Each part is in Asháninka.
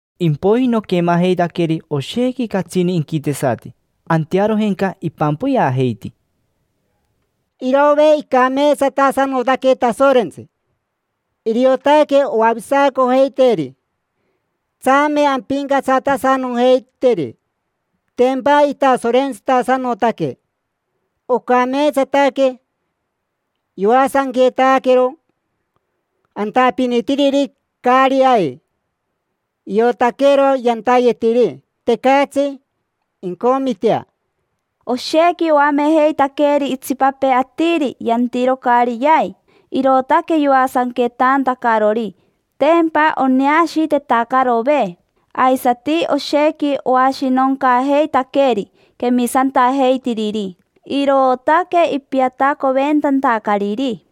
Impoiji noquemajeitaqueri oshequi catsini inquitesati, antearojenca ipampoyeajeiti: Irove, icameetsatasanotaque Tasorentsi: iriotaque oavisacojeiteeri. Tsame ampincatsatasanojeiteri, tempa itasorentsitasanotaque. Ocameetsataque yoasanquetaquero antapinitiriri caari ai, iotaquero yantayetiri, tecatsi incomitea. Oshequi oamejeitaqueri itsipapee atiri yantiro caari yai, irootaque yoasanquetantacarori; tempa oneashiitetacarove. Aisati oshequi oashinoncaajeitaqueri quemisantajeitiriri, irootaque ipiatacoventantacariri.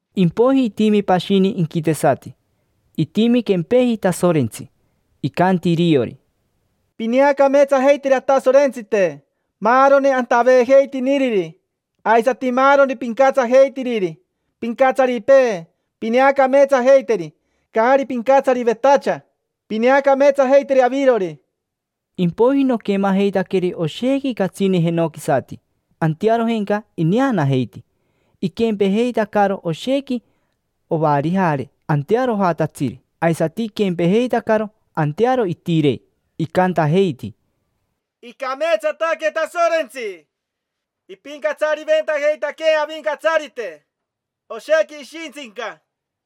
Impoiji itimi pashini inquitesati, itimi quempeji Tasorentsi, icanti iriori: Pineacameetsajeiteri Atasorentsite, maaroni antaveejeitiniriri, aisati maaroni pincatsajeitiriri. Pincatsaripee, pineacameetsajeiteri; caari pincatsarivetacha, pineacameetsajeiteri avirori. Impoiji noquemajeitaqueri oshequi catsini jenoquisati, antearojenca ineanajeiti, iquempejeitacaro oshequi ovarijare antearojatatsiri aisati iquempejeitacaro antearo itirei. Icantajeiti: Icameetsataque Tasorentsi: ipincatsariventajeitaquee Avincatsarite, oshequi ishintsinca.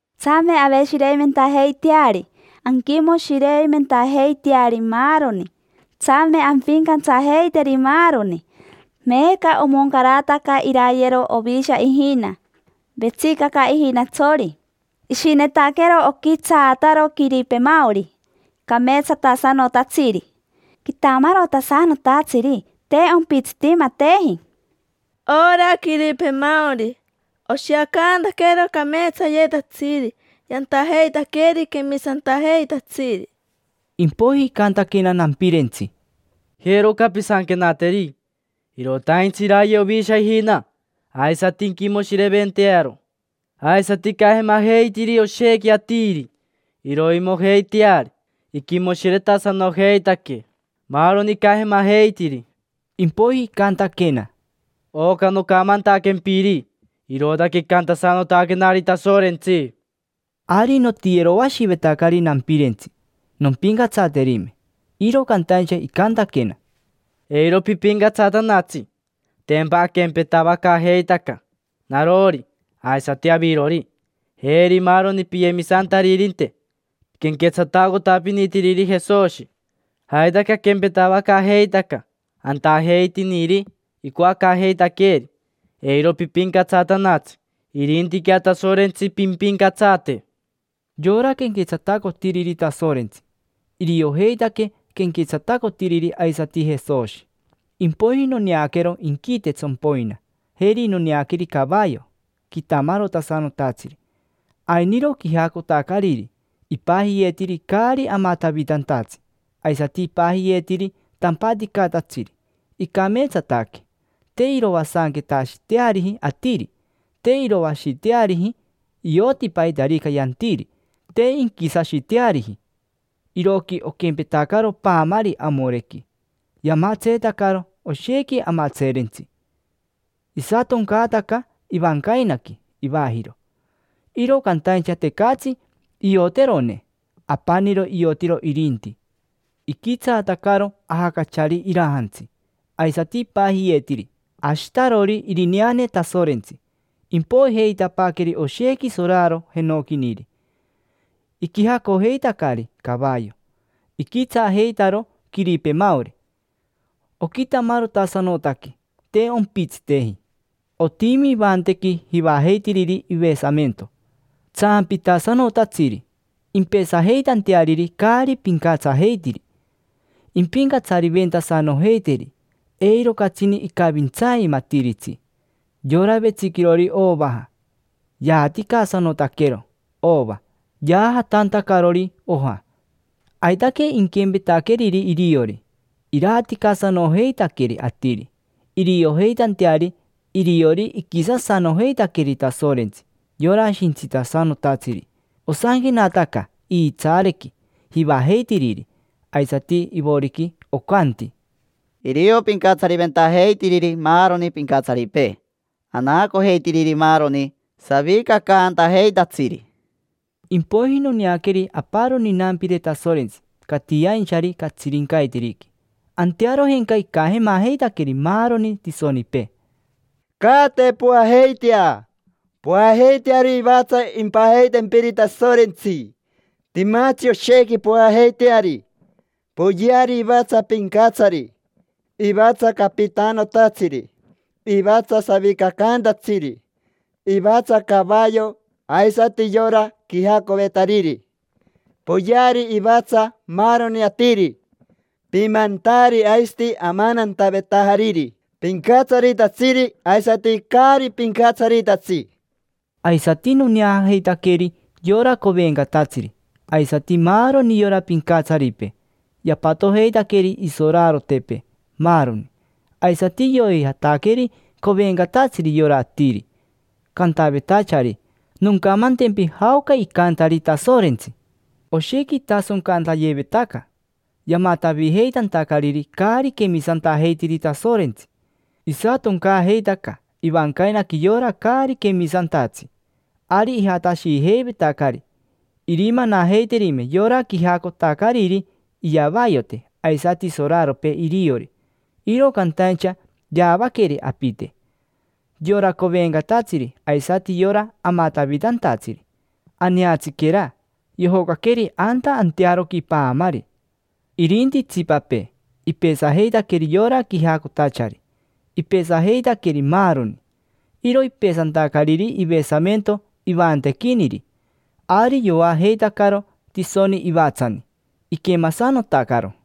Tsame aveshireimentajeiteari, anquimoshireimentajeiteari maaroni. Tsame ampincatsajeiteri maaroni. Meeca omoncarataca irayero Ovisha ijina; vetsicaca ijinatsori. Ishinetaquero oquitsaataro quiripemaori, cameetsatasanotatsiri, quitamarotasanotatsiri; te ompitsitimateji. Ora quiripemaori oshiacantaquero cameetsayetatsiri yantajeitaqueri quemisantajeitatsiri. Impoiji icantaquena nampirentsi: —Jero oca pisanquenateri: “Irotaintsi iraye Ovisha ijina, aisati inquimoshireventearo, aisati icajemajeitiri oshequi atiri iroimojeiteari. Inquimoshiretasanojeitaque maaroni icajemajeitiri”. Impoiji icantaquena: —Oca nocamantaquempiri, irootaque icantasanotaquenari Tasorentsi. Ari notiyeroashivetacari nampirentsi, nompincatsaterime, iro cantaincha icantaquena: —Eiro pipincatsatanatsi. Tempa aquempetavacaajeitaca: narori, aisati avirori, jeri maaroni piyemisantaririnte quenquetsatacotapinitiriri Jesoshi. Aitaque aquempetavacaajeitaca antajeitiniri icoacaajeitaqueeri. Eiro pipincatsatanatsi, irintiquea Tasorentsi pimpincatsate. Yora quenquetsatacotiriri Tasorentsi, iriojeitaque quenquetsatacotiriri aisati Jesoshi. Impoiji noneaquero inquite tsompoina, jeri noneaqueri cavayo quitamarotasanotatsiri. Ainiro quijacotacariri, ipajiyeetiri: Caari Amatavitantatsi; aisati ipajiyeetiri: Tampaticatatsiri. Icameetsataque: te iroasanquetashiteariji atiri, te iroashiteariji. Ioti paitarica yantiri, te inquisashiteariji. Iroqui oquempetacaro paamari amorequi, yamatseetacaro oshequi amatseerentsi. Isatoncaataca ivancainaqui ivajiro, iro cantaincha tecatsi ioterone; apaniro iotiro irinti. Iquitsaatacaro ajacachari irajantsi; aisati ipajiyeetiri: Ashitarori Irineane Tasorentsi. Impoijeitapaaqueri oshequi soraro jenoquiniri, iquijacojeitacari cavayo; iquitsaajeitaro quiripemaori, oquitamarotasanotaque, te ompitsiteji. Otimi ivantequi jivajeitiriri ivesamento, tsaampitasanotatsiri impesajeitanteariri caari pincatsajeitiri. Impincatsariventasanojeiteri, eiro catsini icavintsaimatiritsi. Yora vetsiquirori ovaja yaaticasanotaquero ova yaajatantacarori oja. Aitaque inquempetaqueriri iriori, iraaticasanojeitaqueri atiri, iriojeitanteari iriori iquisasanojeitaqueri Tasorentsi, yora Shintsitasanotatsiri. Osanquenataca iitsaarequi jivajeitiriri, aisati ivoriqui, ocanti: “Irio pincatsariventajeitiriri maaroni pincatsaripee, anaacojeitiriri maaroni savicacantajeitatsiri”. Impoiji noneaqueri aparoni inampire Tasorentsi catiainchari catsirincaiteriqui. Antearojenca icajemajeitaqueri maaroni tisonipee: —Caate, poajeitea. Poajeiteari ivatsa impajeitempiri Tasorentsi; timatsi oshequi poajeiteari. Poyeari ivatsa pincatsari, ivatsa capitanotatsiri, ivatsa savicacaantatsiri, ivatsa cavayo aisati yora quijacovetariri. Poyeari ivatsa maaroni atiri: pimantaari aisati amanantavetajariri, pincatsaritatsiri aisati caari pincatsaritatsi. Aisati noneajeitaqueri yora covencatatsiri aisati maaroni yora pincatsaripee, yapatojeitaqueri isorarotepee, maaroni. Aisati yoijataqueri covencatatsiri yora atiri, cantavetachari: “Noncamantempi jaoca icantari Tasorentsi”. Oshequi itasoncantayevetaca, yamatavijeitantacariri caari quemisantajeitiri Tasorentsi. Isatoncaajeitaca ivancainaqui yora caari quemisantatsi. Ari ijatashijeivetacari irimanajeiterime yora quijacotacariri iyavayote aisati soraropee iriori. Iro cantaincha yaavaqueri apite: yora covencatatsiri aisati yora amatavitantatsiri, tapi. Aneatsiquera, yojocaqueri anta antearoqui paamari. Irinti itsipapee, ipesajeitaqueri yora quijacotachari, ipesajeitaqueri maaroni, peti, peti, peti. Iro ipesantacariri ivesamento ivantequiniri. Ari yoajeitacaro tisoni ivatsani, iquemasanotacaro.